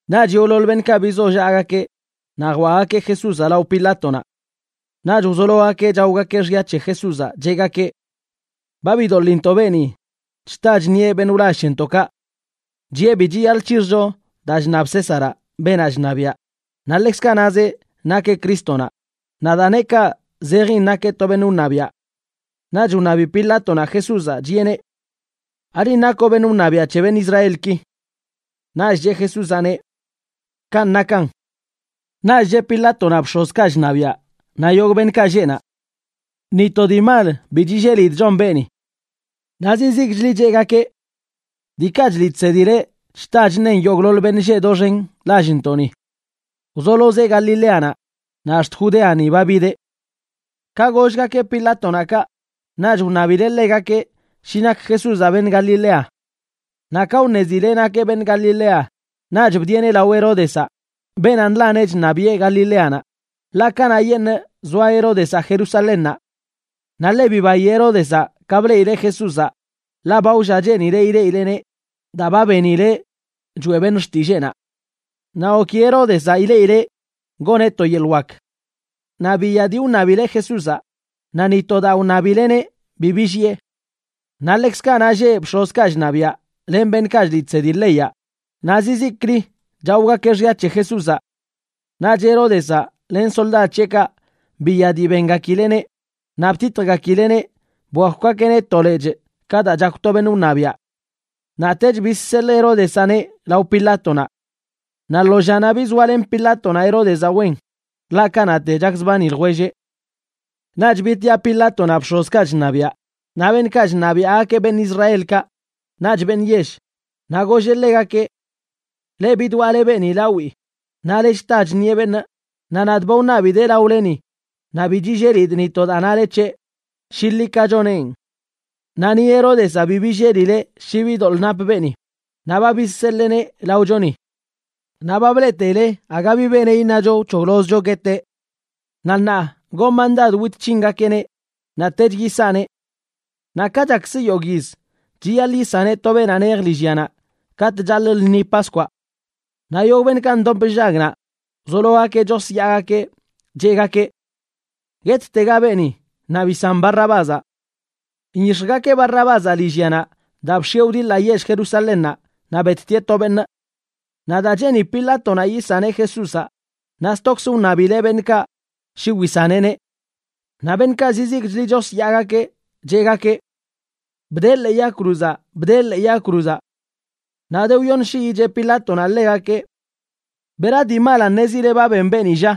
Naꞌch yogꞌḻoḻ beṉꞌkaꞌ bizollaꞌgakeꞌ naꞌ jwaꞌgakeꞌ Jesúzaꞌ lao Pilátonaꞌ. Naꞌch wzologakeꞌ chaogakeꞌ xya c̱he Jesúzaꞌ, cheꞌgakeꞌ: ―Ba bidoḻintoꞌ beeni chta chṉieꞌ beṉꞌ wlall c̱hentoꞌkaꞌ. Chiꞌe bi chiyaḻꞌ c̱hixjcho daa chṉab Césaraꞌ, beenaꞌ chṉabiaꞌ, naꞌ ḻekzkaꞌ nazeꞌ nakeꞌ Crístonaꞌ, naꞌ daa neꞌ kaꞌ zejin nakeꞌ to beṉꞌ wṉabiaꞌ. Naꞌch wṉabi Pilátonaꞌ Jesúzaꞌ, chiꞌeneꞌ: ―¿Alinꞌ nakoꞌ beṉꞌ wṉabiaꞌ c̱he beṉꞌ Israelki? Naꞌch cheꞌ Jesúzaꞌneꞌ: ―Kanꞌ nakan. Naꞌch cheꞌ Pilátonaꞌ bx̱ozkaꞌ chṉabiaꞌ naꞌ yogꞌ beṉꞌkaꞌ lleꞌ naꞌ: ―Ni to dii mal bi chillelidꞌ chon beeni. Naꞌ zizikchli cheꞌgakeꞌ: ―Diikaꞌ chliꞌ chsedileꞌ chta chṉen yogꞌḻoḻ beṉꞌ lleꞌ doxen lallntoꞌni. Wzolozeꞌ Galileanaꞌ, naꞌ ax̱t Judeani ba bideꞌ. Ka gollgakeꞌ Pilátonaꞌ kaꞌ, naꞌch wṉabileꞌ ḻegakeꞌ shi nak Jesúzaꞌ beṉꞌ Galilea. Naꞌ ka wṉezileꞌ nakeꞌ beṉꞌ Galilea, naꞌch bdieꞌneꞌ lao Heródezaꞌ, beenaꞌ nḻaneꞌ chṉabiꞌe Galileanaꞌ, ḻaꞌ kanaꞌyeṉꞌ zoa Heródezaꞌ Jerusalénnaꞌ. Naꞌ ḻe bibayi Heródezaꞌ ka bleꞌileꞌ Jesúzaꞌ, ḻaꞌ ba wlla cheenileꞌ ileꞌileꞌneꞌ daa ba benileꞌ choeꞌ beṉꞌ xtilleenaꞌ. Naꞌ goki Heródezaꞌ ileꞌileꞌ goneꞌ to yeḻꞌ wak. Naꞌ biya dii wṉabileꞌ Jesúzaꞌ, naꞌ ni to daa wṉabileꞌneꞌ bi billiꞌe. Naꞌ ḻekzkaꞌ naꞌ lleꞌ bx̱ozkaꞌ chṉabiaꞌ len beṉꞌkaꞌ chliꞌ chsedi leyaꞌ, naꞌ zizikli chaogakeꞌ xya c̱he Jesúzaꞌ. Naꞌch Heródezaꞌ len soldad c̱heꞌkaꞌ biya dii bengakileꞌneꞌ, naꞌ btitjgakileꞌneꞌ bwakwgakeꞌneꞌ to lechꞌ ka daa chakw to beṉꞌ wṉabiaꞌ. Naꞌtech bizseḻꞌ Heródezaꞌneꞌ lao Pilátonaꞌ. Naꞌ lo llanaꞌ bizoalen Pilátonaꞌ Heródezaꞌ wen, ḻaꞌ kanaꞌte chakzbani ljwelleꞌ. Naꞌch bitiꞌa Pilátonaꞌ bx̱ozkaꞌ chṉabiaꞌ, naꞌ beṉꞌkaꞌ chṉabiaꞌgakeꞌ beṉꞌ Israelkaꞌ naꞌch beṉꞌ yell, naꞌ golleꞌ ḻegakeꞌ: ―Leꞌ bidwaꞌle beeni lawii, nale chta chṉieꞌ beṉꞌ, naꞌ nadꞌ ba wṉabidee laoleni, naꞌ bi chillelidꞌ ni to daa nale c̱heꞌ shi ḻi ka choneꞌn. Naꞌ ni Heródezaꞌ bi billelileꞌ shi bi doḻꞌ nap beeni, naꞌ ba bizseḻeeneꞌ laochoni. Naꞌ ba bleꞌteile aga bi beneꞌ iṉacho wc̱hoglozcho gueteꞌ. Naꞌ ṉaa gonꞌ mandad wit c̱hingakeꞌneꞌ naꞌtech yisanee. Naꞌ ka chakz yogꞌ yiz, chiyaḻꞌ yisaneꞌ to beenaꞌ nej lillyanaꞌ katꞌ chaḻꞌ lṉi Paskwaꞌ. Naꞌ yogꞌ beṉꞌkaꞌ ndop nllag naꞌ, wzologakeꞌ chosyaagakeꞌ, cheꞌgakeꞌ: ―¡Guettega beeni! ¡Naꞌ bisan Barrabázaꞌ! Nyix̱jgakeꞌ Barrabázaꞌ lillyanaꞌ daa bx̱ieꞌ wdiḻaꞌ yell Jerusalénnaꞌ, naꞌ bettieꞌ to beṉꞌ. Naꞌ daa cheeni Pilátonaꞌ yisaneꞌ Jesúzaꞌ, naꞌ stokzə wṉabileꞌ beṉꞌkaꞌ shi wisaneꞌneꞌ. Naꞌ beṉꞌkaꞌ zizikchli chosyaagakeꞌ, cheꞌgakeꞌ: ―¡Bdee ḻee yag cruzaꞌ! ¡Bdee ḻee yag cruzaꞌ! Naꞌ de wyoṉ shiyi cheꞌ Pilátonaꞌ ḻegakeꞌ: ―¿Bera dii malanꞌ ṉezile ba ben beeni, lla?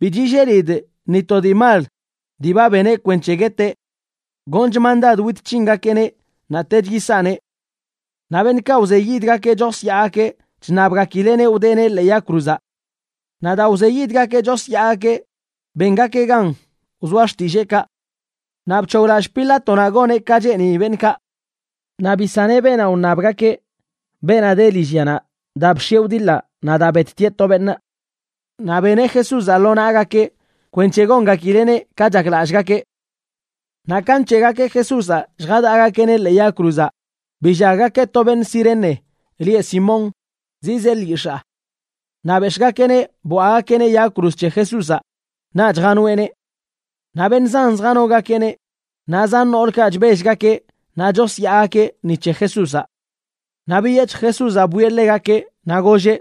Bi chillelidꞌ ni to dii mal dii ba beneꞌ kwenc̱he gueteꞌ. Gonchꞌ mandad wit c̱hingakeꞌneꞌ naꞌtech yisanee. Naꞌ beṉꞌkaꞌ wzeyidgakeꞌ chosyaagakeꞌ chṉabgakileꞌneꞌ wdeeneꞌ ḻee yag cruzaꞌ. Naꞌ daa wzeyidgakeꞌ chosyaagakeꞌ, bengakeꞌ gan wzoa xtilleekaꞌ. Naꞌ bc̱hoglallꞌ Pilátonaꞌ goneꞌ ka cheeni beṉꞌkaꞌ. Naꞌ bisaneꞌ beenaꞌ wṉabgakeꞌ, beenaꞌ de lillyanaꞌ daa bx̱ieꞌ wdiḻaꞌ naꞌ daa bettieꞌ to beṉꞌ. Naꞌ beneꞌ Jesúzaꞌ lo naꞌgakeꞌ kwenc̱he gongakileꞌneꞌ ka chaklallꞌgakeꞌ. Naꞌ ka nc̱heꞌgakeꞌ Jesúzaꞌ lljadaꞌgakeꞌneꞌ ḻee yag cruzaꞌ, billaggakeꞌ to beṉꞌ Cirene lieꞌ Simón zizee lyix̱aa. Naꞌ bex̱ꞌgakeꞌneꞌ bwaꞌgakeꞌneꞌ yag cruz c̱he Jesúzaꞌ naꞌch janoeꞌneꞌ. Naꞌ beṉꞌ zan zjanogakeꞌneꞌ, naꞌ zan noolkaꞌ chbellgakeꞌ naꞌ chosyaagakeꞌ ni c̱he Jesúzaꞌ. Naꞌ biyec̱hj Jesúzaꞌ bwieꞌ ḻegakeꞌ naꞌ golleꞌ: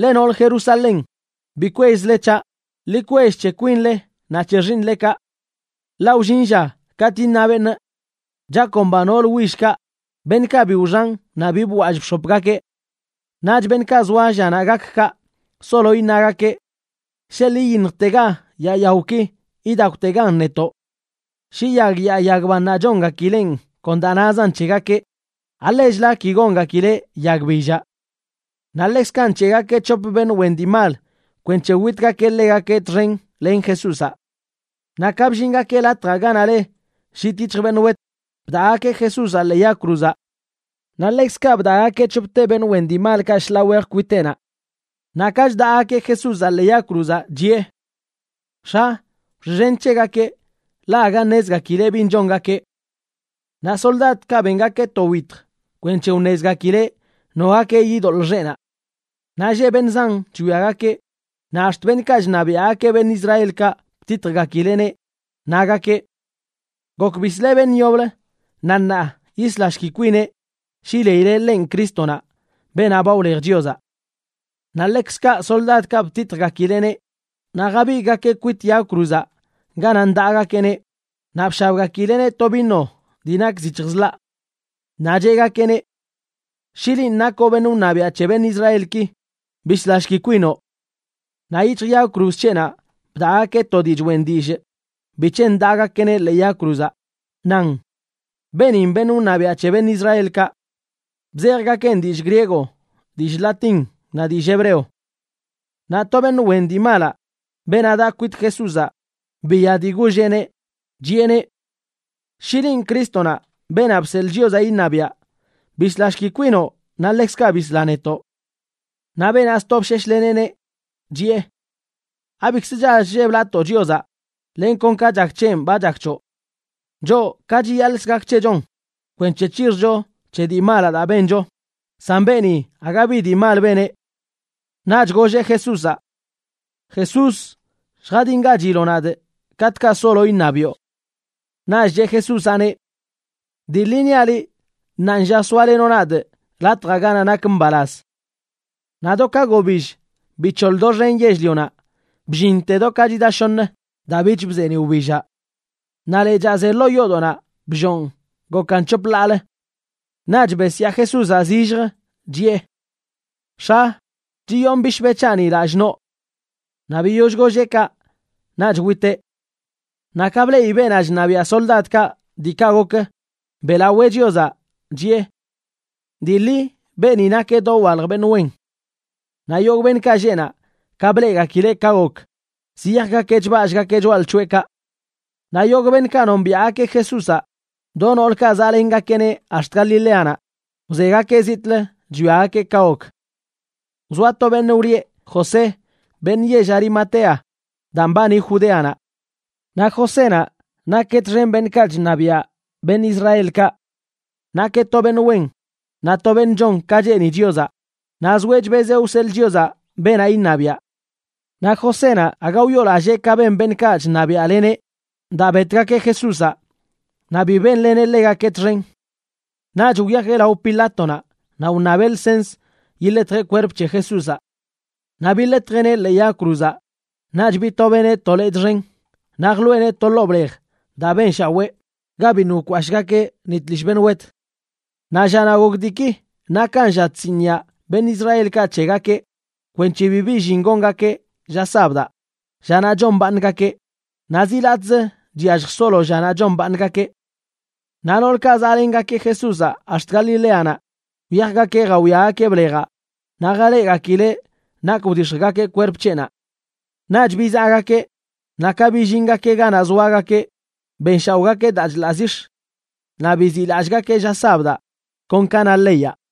―Leꞌ nool Jerusalén, bi kwellzle c̱haꞌ; ḻi kwell c̱he kwinle naꞌ c̱he xiiṉlekaꞌ. Ḻaꞌ wllin lla katꞌ iṉa beṉꞌ: “Chakomba nool willkaꞌ, beṉꞌkaꞌ bi wxan naꞌ bi bwall bx̱opgakeꞌ.” Naꞌch beṉꞌkaꞌ zoa llanaꞌ gak kaꞌ, solo iṉagakeꞌ: “Sheḻꞌ iyiṉjtega yaa yaoki idakwtegan netoꞌ.” Shi yag yaa yag bannaꞌ chongakileꞌn kon daa nazan c̱hegakeꞌ, ¿alechla ki gongakileꞌ yag billaꞌ? Naꞌ ḻekzkaꞌ nc̱heꞌgakeꞌ c̱hop beṉꞌ wen dii mal kwenc̱he witgakeꞌ ḻegakeꞌ txen len Jesúzaꞌ. Naꞌ ka bllingakeꞌ latjaꞌ ganaꞌ le Llit Yic̱hj Beṉꞌ Wet, bdaꞌgakeꞌ Jesúzaꞌ ḻee yag cruzaꞌ. Naꞌ ḻekzkaꞌ bdaꞌgakeꞌ c̱hopte beṉꞌ wen dii malkaꞌ shḻaa wej kwiteꞌnaꞌ. Naꞌ ka chdaꞌgakeꞌ Jesúzaꞌ ḻee yag cruzaꞌ, chiꞌe: ―X̱a, wxiꞌxen c̱hegakeꞌ, ḻaꞌ aga ṉezgakileꞌ bin chongakeꞌ. Naꞌ soldadkaꞌ bengakeꞌ to wyitj kwenc̱he wṉezgakileꞌ nogakeꞌ yidoḻꞌ xeꞌnaꞌ. Naꞌ lleꞌ beṉꞌ zan chwiagakeꞌ, naꞌ ax̱t beṉꞌkaꞌ chṉabiaꞌgakeꞌ beṉꞌ Israelkaꞌ btitjgakileꞌneꞌ, nagakeꞌ: ―Gok bisleꞌ beṉꞌ yoblə, naꞌ ṉaa yislashki kwineꞌ shi leileꞌ ḻenꞌ Crístonaꞌ, beenaꞌ ba wlej Chiozaꞌ. Naꞌ ḻekzkaꞌ soldadkaꞌ btitjgakileneꞌ, naꞌ jabigꞌgakeꞌ kwit yag cruzaꞌ ganaꞌ ndaꞌgakeꞌneꞌ naꞌ bshabgakileꞌneꞌ to vino dii nak zic̱hj zḻaꞌ. Naꞌ cheꞌgakeꞌneꞌ: ―Shi linꞌ nakoꞌ beṉꞌ wṉabiaꞌ c̱he beṉꞌ Israelki, bislashki kwinoꞌ. Naꞌ yic̱hj yag cruz c̱heꞌnaꞌ bdaꞌgakeꞌ to dii choꞌen dillꞌ bic̱he ndaꞌgakeꞌneꞌ ḻee yag cruzaꞌ, nan: “Beenin beṉꞌ wṉabiaꞌ c̱he beṉꞌ Israelkaꞌ.” Bzejgakeꞌn dillꞌ griego, dillꞌ latín naꞌ dillꞌ hebreo. Naꞌ to beṉꞌ wen dii malaꞌ, beenaꞌ daꞌ kwit Jesúzaꞌ, biya dii golleꞌneꞌ, chiꞌeneꞌ: ―Shi linꞌ Crístonaꞌ, Beenaꞌ Bseḻꞌ Chiozaꞌ iṉabiaꞌ, bislashki kwinoꞌ naꞌ ḻekzkaꞌ bisla netoꞌ. Naꞌ beenaꞌ sto bsheshleneꞌneꞌ, chiꞌe: ―¿Abikzə chall chlleblatoo Chiozaꞌ?, len kon ka chak c̱henꞌ ba chak c̱hoꞌ. Choꞌ, ka chiyaḻꞌkz gak c̱hechonꞌ kwenc̱he c̱hixjcho c̱he dii malaꞌ daa bencho; san beeni aga bi dii mal beneꞌ. Naꞌch golleꞌ Jesúzaꞌ: ―Jesús, lljadingachiloꞌ nadꞌ katꞌkaꞌ solo iṉabiꞌo. Naꞌch cheꞌ Jesúzaꞌneꞌ: ―Dii ḻi niaꞌ liꞌ, ṉaanlla soalenoꞌ nadꞌ latjaꞌ ganaꞌ nak mbalaz. Naꞌ do ka gobill bic̱hoḻ doxen yell-lionaꞌ, bllinte do ka chida shoṉ, daa bich bzeeniꞌ wbillaꞌ. Naꞌ lechaa ze ḻoo yoodoꞌnaꞌ bllonꞌ gokan c̱hop ḻaalə. Naꞌch besyaa Jesúzaꞌ zilljə, chiꞌe: ―X̱a, chiyonꞌ bishbe c̱haꞌni lallꞌ noo. Naꞌ biyoll golleꞌ kaꞌ naꞌch witeꞌ. Naꞌ ka bleꞌi beenaꞌ chṉabiaꞌ soldadkaꞌ diikaꞌ gok, beꞌlawee Chiozaꞌ, chiꞌe: ―Dii ḻi beeni nakeꞌ dowalj beṉꞌ wen. Naꞌ yogꞌ beṉꞌkaꞌ lleꞌ naꞌ, ka bleꞌgakileꞌ ka gok, ziyajgakeꞌ chballꞌgakeꞌ choꞌalc̱hoꞌekaꞌ. Naꞌ yogꞌ beṉꞌkaꞌ nombiaꞌgakeꞌ Jesúzaꞌ, do noolkaꞌ zaꞌlengakeꞌneꞌ ax̱t Galileanaꞌ, wzegakeꞌ zitꞌlə chwiagakeꞌ ka gok. Wzoa to beṉꞌ wlieꞌ José, beṉꞌ yell Arimatea, daa mbani Judéanaꞌ. Naꞌ Josénaꞌ nakeꞌ txen beṉꞌkaꞌ chṉabiaꞌ beṉꞌ Israelkaꞌ. Nakeꞌ to beṉꞌ wen naꞌ to beṉꞌ chon ka cheeni Chiozaꞌ, naꞌ zoeꞌ chbezeꞌ wseḻꞌ Chiozaꞌ beenaꞌ iṉabiaꞌ. Naꞌ Josénaꞌ aga wyoolallee ka ben beṉꞌkaꞌ chṉabiaꞌleneꞌ daa betgakeꞌ Jesúzaꞌ, naꞌ bi benleneꞌ ḻegakeꞌ txen. Naꞌch wyajeꞌ lao Pilátonaꞌ naꞌ wṉabeꞌ lsens yiḻetjeꞌ kwerp c̱he Jesúzaꞌ. Naꞌ biḻetjeꞌneꞌ ḻee yag cruzaꞌ, naꞌch bitobeꞌneꞌ to lechꞌ xen naꞌ jḻoꞌeneꞌ to ḻoo blej daa benshawee, ga biṉꞌ wkashꞌgakeꞌ ni tlishꞌ beṉꞌ wet. Naꞌ llanaꞌ gok diiki nakan lla chsiniꞌa beṉꞌ Israelkaꞌ c̱hegakeꞌ kwenc̱he bibi llin gongakeꞌ lla sabdaꞌ, llanaꞌ chombaaṉgakeꞌ, naꞌ zi latꞌzə chyallj solo llanaꞌ chombaaṉgakeꞌ. Naꞌ noolkaꞌ zaꞌlengakeꞌ Jesúzaꞌ ax̱t Galileanaꞌ, wyajgakeꞌ jawiagakeꞌ blejaꞌ naꞌ jaleꞌgakileꞌ nak wdix̱jgakeꞌ kwerp c̱heꞌnaꞌ. Naꞌch bizaꞌgakeꞌ, naꞌ ka billingakeꞌ ganaꞌ zoagakeꞌ, benshaoꞌgakeꞌ daa chḻaꞌ zix̱. Naꞌ biziꞌlallꞌgakeꞌ lla sabdaꞌ kon ka na leyaꞌ.